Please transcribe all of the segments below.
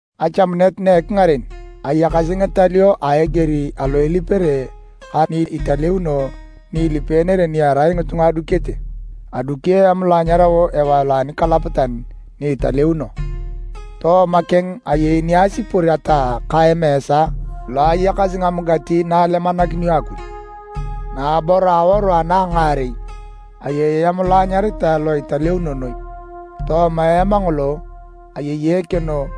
Achamunet na ekingaren, ayakasi ngitalio a eger alo ilipere ka ni italeuno ni ilipeenere ni erai ngitunga adukete. Adukio eam lo anyarao ewae lo anikalapatan ni italeuno. Tooma keng ayei ni asipor ataa ka emeesa lo ayakasi ngamugati na alemanakinio Akuj. Naabor a awaru ana a ngaarei, ayei Eam lo anyaritae lo Italeuno Noi. Tooma eam ngolo, ayei ekeno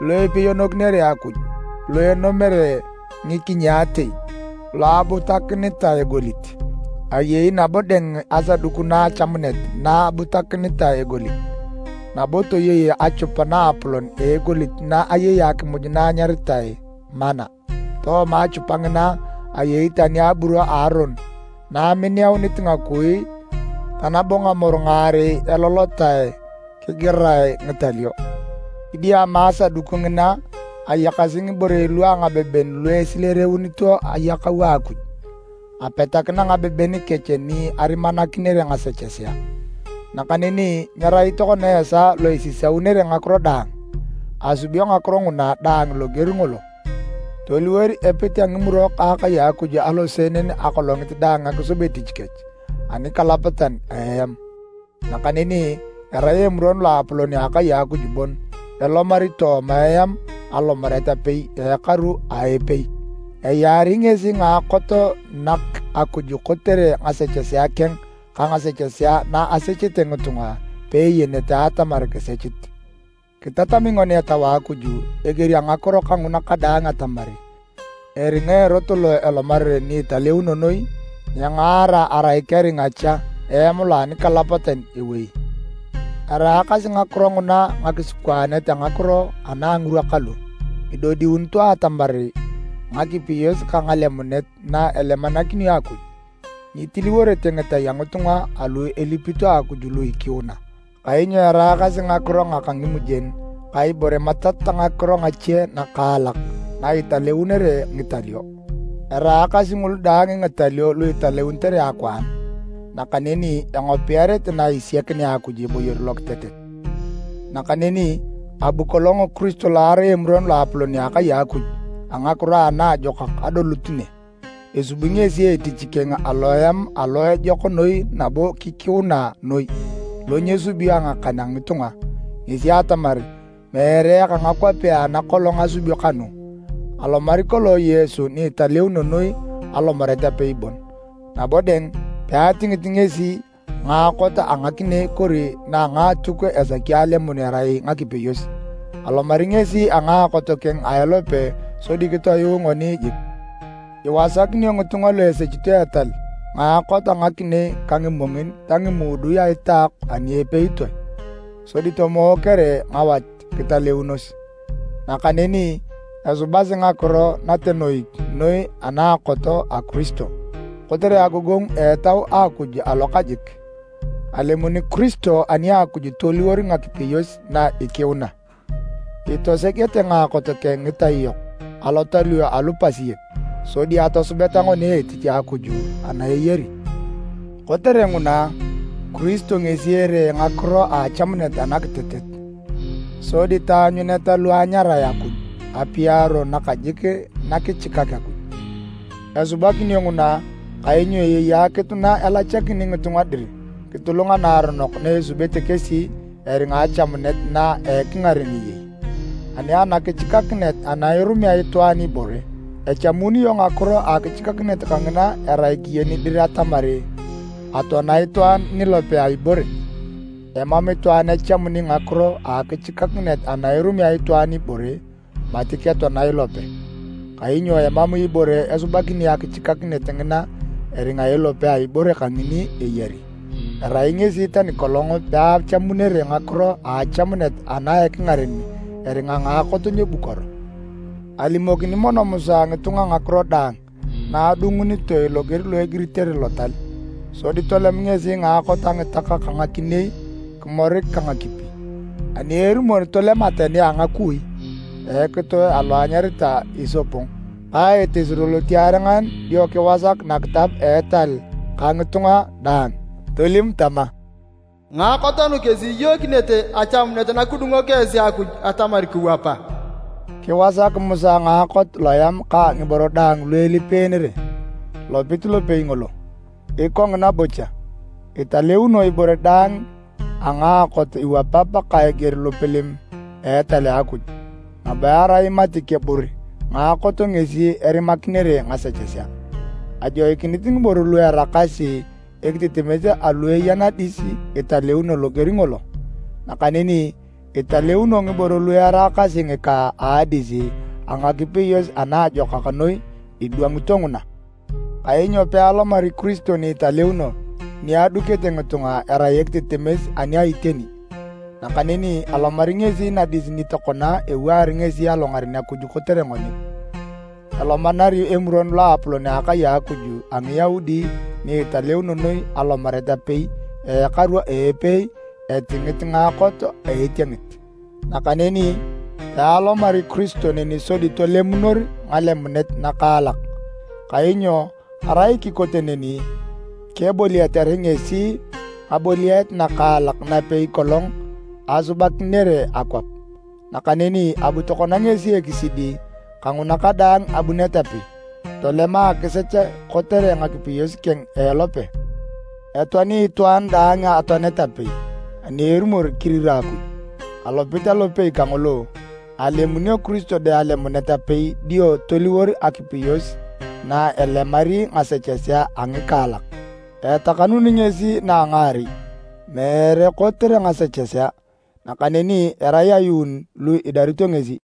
lo ipeyonokinere Akuj lo enomere ngikinyaatei, lo abutakinitae egolit. Ayei nabo dang Asaduku na a Achamunet na abutakinitae egolit nabo toyei achupa naapolon a egolit na ayei akimuj na enyaritae manna. Tooma achupa ngina, ayei tani aburo a Aron na eminiaunit ngakui ta nabo ngamoru ngaarei elolotae kigirae ngitalio. Kidiama Asaduku ngina ayakasi ngiborei lua ngabeben lu esileereunito ayakau a Akuj, apetakina ngabeben kech ni arimanakinere ngasechesea. Nakaneni nyerai tokona esaa lo isisaunere ngakiro daang. Asubio ngakiro nguna daang loger ngolo. Toliwor epit a ngimurok a akai a Akuj aloseenen akolongit daang akisub etich kech anikalapatan a eam, nakaneni erai Emuron Loapolon a akai a Akuj bon elomari tooma eam alomaret apei a ekaru a epei. Eyaari ngesi ngaakot nak Akuj kotere ngasechesea keng ka ngasechesea na asechete ngitunga peeyenete atamar kisechit. Kitatami ngoni Etau a Akuj a eger a ngakiro kanguna kadaang atamar eringa erot lo elomarere ni Italeuno Noi nyengaara arai keringa cha eam lo anikalapatan ewei. Eraakasi ngakiro nguna ngakisikwaanet a ngakiro ana a ngirwa kalu. Idodiunito atamar ngakipeyos ka ngalemunet na elemanakinio Akuj, nyitiliworete ngitai a ngitunga alu ilipito Akuj lu ikiuna, kainyo eraakasi ngakiro ngaka ngimujen ka ibore matat ta ngakiro ngache nakaalak na italeunere ngitalio. Eraakasi ngulu daang ngitalio lu italeunitere akwaan nakaneni engopiarete na isiakinea Akuj eboyor lokitetet. Nakaneni abu kolong Kiristo lo erai Emuron Loapolon a akai a Akuj a ngakiro anaajokak adolut ne. Esubi ngesi etich keng aloeam alo ejok noi nabo kikiuna noi, lo nyesubio a ngakan a ngitunga. Ngesi atamar, meere eka ngakwapea ana kolong asubio kanu. Alomari kolong Yesu ni Italeuno Noi alomaret apei bon, nabo dang, peatingit ngesi ngaakot a ngakinei kori na a ngaatuk esaki alemun erai ngakipeyos. Alomari ngesi a ngaakot keng a elope sodi kitoyuu ngoni jik. Iwasakinio ngitunga lu esechito etal ngaakot a ngakinei ka ngimongin ta ngimuudui a itaok ani epeitoe, sodi tomookere ngawat kitaleunos. Nakaneni, esubasi ngakiro natenoik noi anaakot a Kiristo! Kotere agogongu a Etau a Akuj alokajik, alemun Kiristo ani a Akuj toliwor ngakipeyos na ikiuna. Itosegete ngaakot keng ngitai yok alotalio alu pasiek, sodi atosubeta ngoni etich a Akuj ana eyari. Kotere nguna, Kiristo ngesi eree ngakiro a achamunet anakitetet, sodi taanyuneta lu anyarae Akuj apiaro nakajik nakichikak Akuj. Esubakinio nguna kainyo ayei akitu na elachakini ngitunga dir kitulung naaronok na asubete kesi eringa achamunet na a ekingaren eyei. Ani anakichikakinet ana irumea itwaan ibore, echamunio ngakiro a akichikakinet kangina erai keyen dir atamar atoana itwaan nilope a ibore. Emam itwaan echamuni ngakiro a akichikakinet ana irumea itwaan ibore mati ketoana ilope, kainyo emam ibore esubakini akichikakinet ngina eringa ilope a ibore kangini eyari. Erai ngesi tani kolong peachamunere ngakiro a achamunet ana a ekingaren eringa ngaakot nyebukoro. Alimokini mono Musa ngitunga ngakiro daang na adungunitoe loger lo egiritere Lotal. Sodi tolem ngesi ngaakot a ngitak ka ngakinei kimorik ka ngakipi, ani erumor tolem ateni a ngakui a ekitoe alo enyaritae isopog ka etesiro lotiarengan dio kiwasak nakitab a etal ka ngitunga daang. Tolim tama, “Ngaakot nu kesi iyookinete achamunet na kidungok esi Akuj atamar kiwapa.” Kiwasak Musa ngaakot loeam ka ngiboro daang lu elipeenere, lopit lopei ngolo. Ikongina bocha, italeunio ibore daang a ngaakot iwapap ka eger lopalem a etal a Akuj, nabo erai mati kebukor ngaakot ngesi erimakinere ngasechesea. Ajoikinit ngiboro lu eraakasi ekitetemes alu eya nadis italeunio loger ngolo. Nakaneni, italeunio ngiboro lu eraakasi ngika a adis a ngakipeyos ana ejokak noi idwangito nguna. Kainyo pealomari Kiristo ni italeuno ni adukete ngitunga erai ekitetemes ani a iteni. Nakaneni alomari ngesi nadis ni tokona ewaar ngesi alongaren Akuj kotere ngoni. Elomanari Emuron Loapolon a akai a Akuj a Ngiyaudi ni Italeuno Noi alomaret apei a ekaru a epei etingit ngaakot a etiengit. Nakaneni pealomari Kiristo neni sodi tolemunor ngalemunet ngakaalak, kainyo arai kikote neni, keboliatere ngesi ngaboliaret ngakaalak napei kolong asubakinere akwap. Nakaneni abu tokona ngesi ekisidi kanguna kadaang abunet apei, tolema akisech kotere ngakipeyos keng a elope. Etoani itwaan daang atoanet apei ani erumor kirira Akuj. Alopit alopei kangolo alemunio Kiristo dang alemunet apei dio toliwor akipeyos na elemari ngasechesea a ngikaalak. Etakanuni ngesi na a ngaarei, meere kotere ngasechesea, nakaneni erai ayuun lu idarito ngesi.